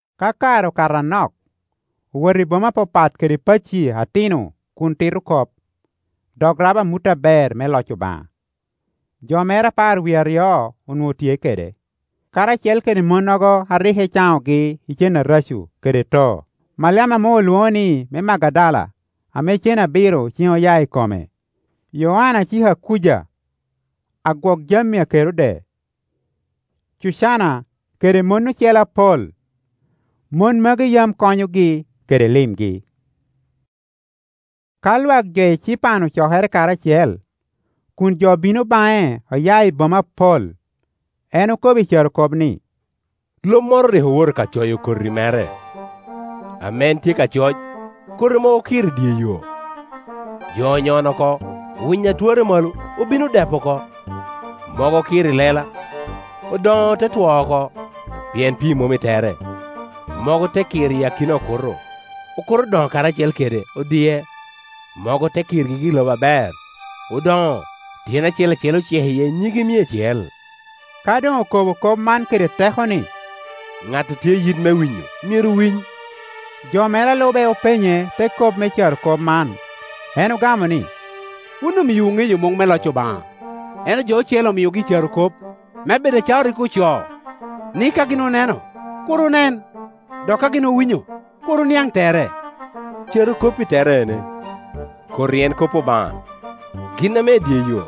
Ka kare okato anok, owoto i boma apapat kede pacci atino kun tito kop, dok rabo amut aber me loc Obaŋa. Jo mere apar wie aryo onwoŋo tye kede, karacel kede monnogo a rik ecanogi i cen areco kede too: Maliam ame olwoŋo ni me Magdala, ame cen abiro cen oya i kome; Yoanna cik a Kuja, agwokjami a Kerode; Cucanna, kede mon ocele apol. Mon magi yam konyogi kede limgi. Ka lwak jo ecipan ocokere karacel, kun jo bino baŋe oya i boma apol, en okobo i carokop ni, “Lo moro rik owoto ka coyo koti mere. Ame en tye ka coc, koti mogo okir i dye yo, jo onyono oko, winy a twarre malo obino odepo oko. Mogo okir i lela; odoŋo, te two oko, pien pii mom i tere. Mogo te kir i akina okuto; okuto odoŋo karacel kede odie. Mogo te kir gigi i lobo aber, odoŋo, tyene acel acel ocek iye nyige mia acel.” Ka doŋ okobo kop man kede teko ni, “Ŋat a tye i yit me winyo, myero winy!” Jo mere a lube openye te kop me carokop man. En ogamo ni, “Wun omiowu ŋeyo muŋ me loc Obaŋa, ento jo ocele omiogi i carokop, me bed acalo rik ocoo, ni ka gin oneno, kur onen, dok ka gin owinyo, kur oniaŋ tere. “Carokop-pi tere en: Koti en kop Obaŋa. Gin ame i dye yo,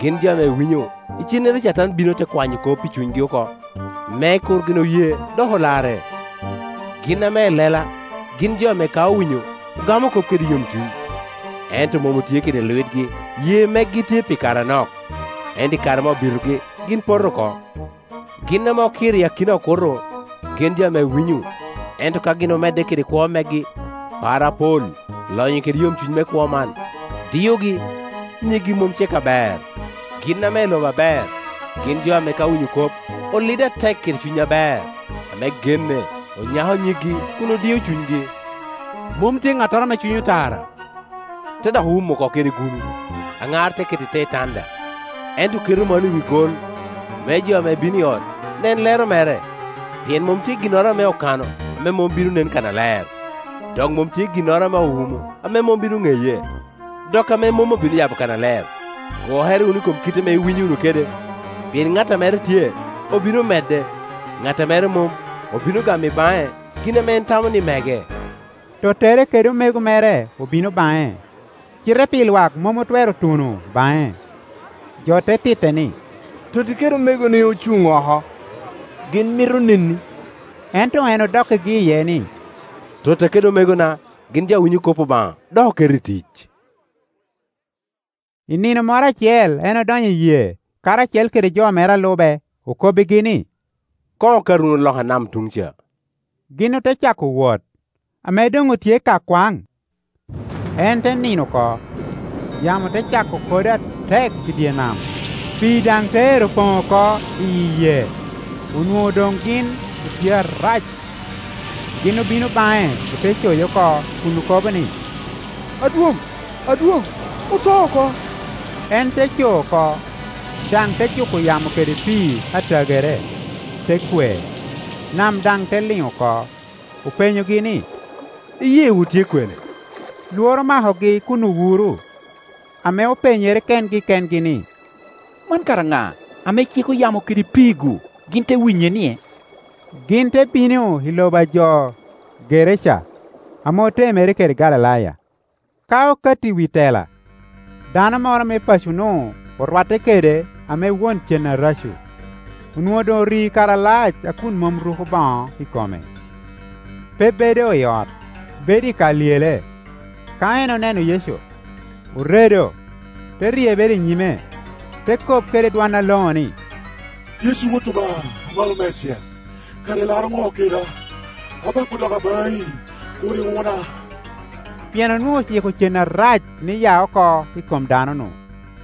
gin jo ame winyo, icennere Catan bino, te kwanyo kop i cunygi oko, me kur gin oye dok olarre. Gin ame i lela, gin jo ame ka owinyo, ogamo kop kede yomcuny, ento mom otye kede lwitgi, ye megi tye pi kare anok, ento i kare ame obitogi, gin poto oko. Gin ame okir i akina okuto, gin jo ame winyo, ento ka gin omedde kede kwo megi, par apol, lonyo kede yomcuny me kwo man diogi, nyiggi mom cek aber. Gin ame i lobo aber, gin jo ame ka owinyo kop, olido atek kede cuny aber, ame genne, onyako nyiggi kun odio cunygi. “Mom tye ŋattoro ame cwinyo tara te dok wumo oko kede gulu, aŋar keto i te tanda, ento keto malo i wi gol, me jo ame bino i ot nen lero mere. Pien mom tye ginnoro ame okano ame mom bino nen kannaler, dok mom tye ginnoro ame owumo ame mom bino ŋeye, dok ame mom obino yabo kannaler. Gwokere wunu i kom kite ame iwinyo wunu kede; pien ŋat a mere tye, obino medde, ŋat a mere mom, obino gamo i baŋe gin ame en tamo ni mege.” Tottere kede omego mere obino baŋe, cite pi lwak mom otwero tuno baŋe. Jo te titte ni, “Totti kede omegoni ocuŋ oko, gin mito neni.” Ento en odokkigi iye ni, “Totta kede omegona gin jo ame winyo kop Obaŋa, dok oketo i tic.” I nino moro acel en odonyo i yee karacel kede jo mere a lube, okobbigi ni, “Koŋ okat wunu loka nam tuŋ ca,” gin ote cako wot. Ame doŋ otye ka kwaŋ, en te nino oko, yamo te cako kodo atek i dye nam, pii daŋ te ero poŋ oko iyi yee, onwoŋo doŋ gin otye arac. Gin obino baŋe ote coye oko kun okobo ni, “Adwoŋ, Adwoŋ, oto oko!” En te co oko, daŋ te juko yamo kede pii a tagere, te kwe, nam daŋ te liŋ oko. Openyogi ni, “Iyeewu tye kwene?” Lworo omakogi kun owuro, ame openyere kengi kengi ni, “Man kara ŋa, ame ciko yamo kede pii-gu, gin te winye-nie?” Gin te bino i lobo a jo Geraca ame otemere kede Galilaya. Ka okato i wi tela, dano moro me paco-nu orwatte kede ame won cen areco. Onwoŋo doŋ ori kare alac a kun mom ruko boŋo i kome; pe bedo i ot, bedo i ka lyele. Ka en oneno Yecu, oredo, te ryebere i nyime, te kop kede dwon aloŋo ni, “Yecu, Wot Obaŋa Amalo Meicel, kara ilaro ŋo keda? Abako doga baŋi, kur iwuna.” Pien onwoŋo ociko cen arac ni ya oko i kom dano-nu.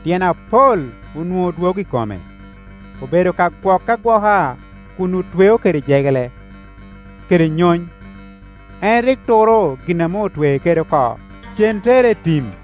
Tyen apol onwoŋo dwogo i kome, obedo ka gwoke agwoka kun otwee kede jegere kede nyony; en rik turo gin ame otwee kede oko, cen tere i tim.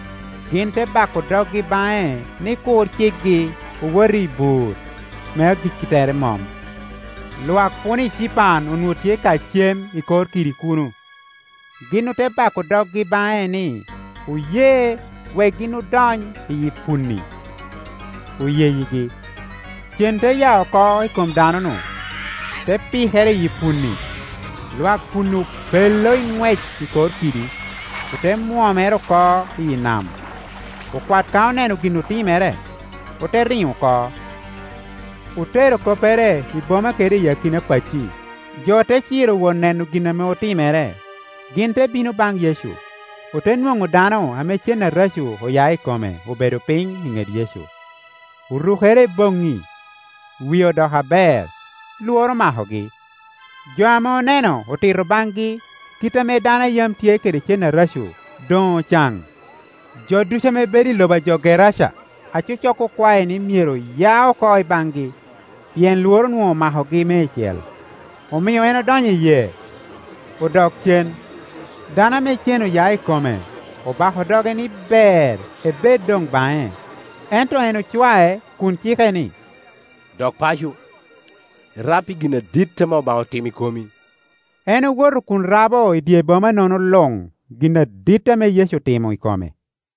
Gin te bako doggi baŋe ni kur cikgi owot i bur ame agikki tere mom. Lwak puno ecipan onwoŋo tye ka cem i kor kidi kuno. Gin ote bako doggi baŋe ni oye wek gin odony i punni; oyegi. Cen te ya oko i kom dano-nu, te pikere i punni; lwak puno obelle i ŋwec i kor kidi, ote mwonyere oko iyi nam. Okwat ka oneno gin otimere, ote riŋo oko, otero koppere i boma kede i akina pacci. Jo te ciro wot neno gin ame otimere. Gin te bino baŋ Yecu, ote nwoŋo dano ame cen areco oya i kome obedo piny i ŋet Yecu, orukere i boŋŋi, wie odoko aber; lworo omakogi. Jo ame oneno otito baŋgi kit ame dano a yam tye kede cen areco doŋ ocaŋ. Jo ducu ame bedo i lobo a jo Geraca acocok okwae ni myero ya oko i baŋgi, pien lworo onwoŋo omakogi meicel; omio en odonyo i yee, odok cen. Dano ame cen oya i kome obako doge ni ber ebed doŋ baŋe: ento en ocwae kun ci ke ni, “Dok paco, irab pi gin adit ame Obaŋa otimo i komi.” En owoto kun rabo i dye boma-nono luŋ gin adit ame Yecu otimo i kome.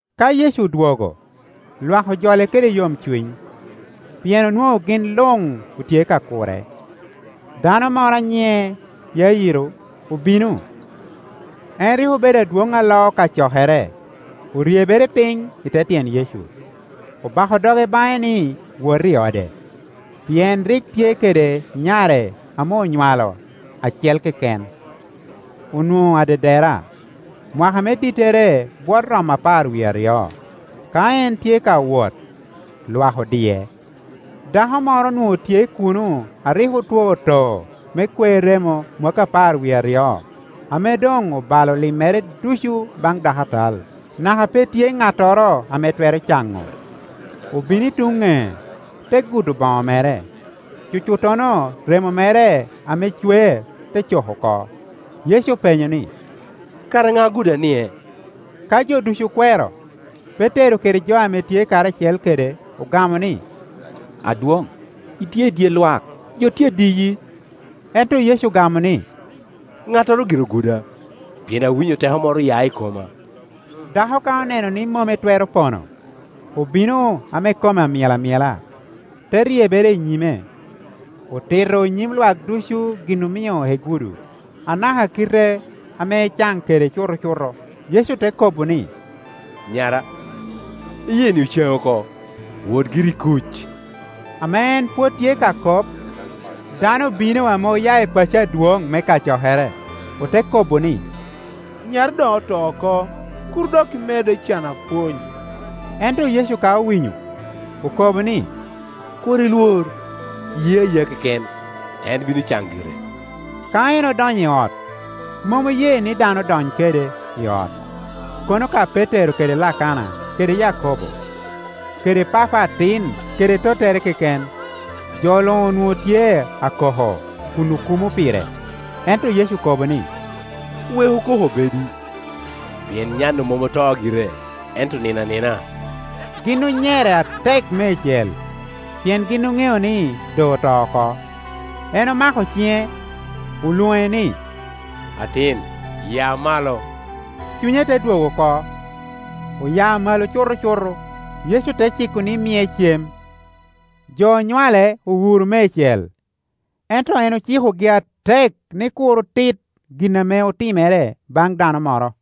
Ka Yecu odwogo, lwak ojole kede yomcuny, pien onwoŋo gin luŋ otye ka kure. Dano moro a nyiŋe Yairo obino; en rik obedo adwoŋ a loo kacokere. Oryebere piny i te tyen Yecu, obako doge baŋe ni wot i ode, pien rik tye kede nyare ame onywalo acel keken, onwoŋo adedera, mwaka me dittere bwot romo apar wie aryo. Ka en tye ka wot, lwak odie. Dako moro onwoŋo tye kuno a rik otwo too me kwer remo mwakki apar wie aryo, ame doŋ obalo limmere ducu baŋ dakatal, naka pe tye ŋattoro ame twero caŋo. Obino i tuŋ ŋec, te gudo boŋo mere; cucuttono remo mere ame cwer te cok oko. Yecu openyo ni, “Kara ŋa oguda-nie?” Ka jo ducu okwero, Petero kede jo ame tye karacel kede ogamo ni, “Adwoŋ, itye i dye lwak, jo tye adiyi.” Ento Yecu ogamo ni, “Ŋattoro gire oguda, pien awinyo teko moro oya i koma.” Dako ka oneno ni mom etwero pono, obino ame kome myel amyela, te ryebere i nyime, otito i nyim lwak ducu gin omio egudo, anaka kite ame ecan kede cutocuto. Yecu te kobo ni, “Nyara, iyeeni ocaŋi oko; wot giri i kuc.” Ame en pwod tye ka kop, dano obino ame oya i paco adwoŋ me kacokere, ote kobo ni, “Nyari doŋ oto oko; kur dok imedde cano apwony.” Ento Yecu ka owinyo, okobo ni, “Kur ilwor; ye ayea keken, en bino caŋ gire.” Ka en odonyo i ot, mom oye ni dano dony kede i ot, kono ka Petero kede Lakana kede Yakobo, kede papa atin kede tottere keken. Jo luŋ onwoŋo tye akokko kun okumo pire; ento Yecu okobo ni, “Weku koko obedi, pien nya-nu mom oto gire, ento onino anina.” Gin onyere atek meicel, pien gin oŋeo ni doŋ oto oko. En omako ciŋe olwoŋe ni, “Atin, ya malo.” Cunye te dwogo oko, oya malo cutocuto; Yecu te ciko ni mie cem. Jo onywale owuro meicel; ento en ocikogi atek ni kur otit gin ame otimere baŋ dano moro.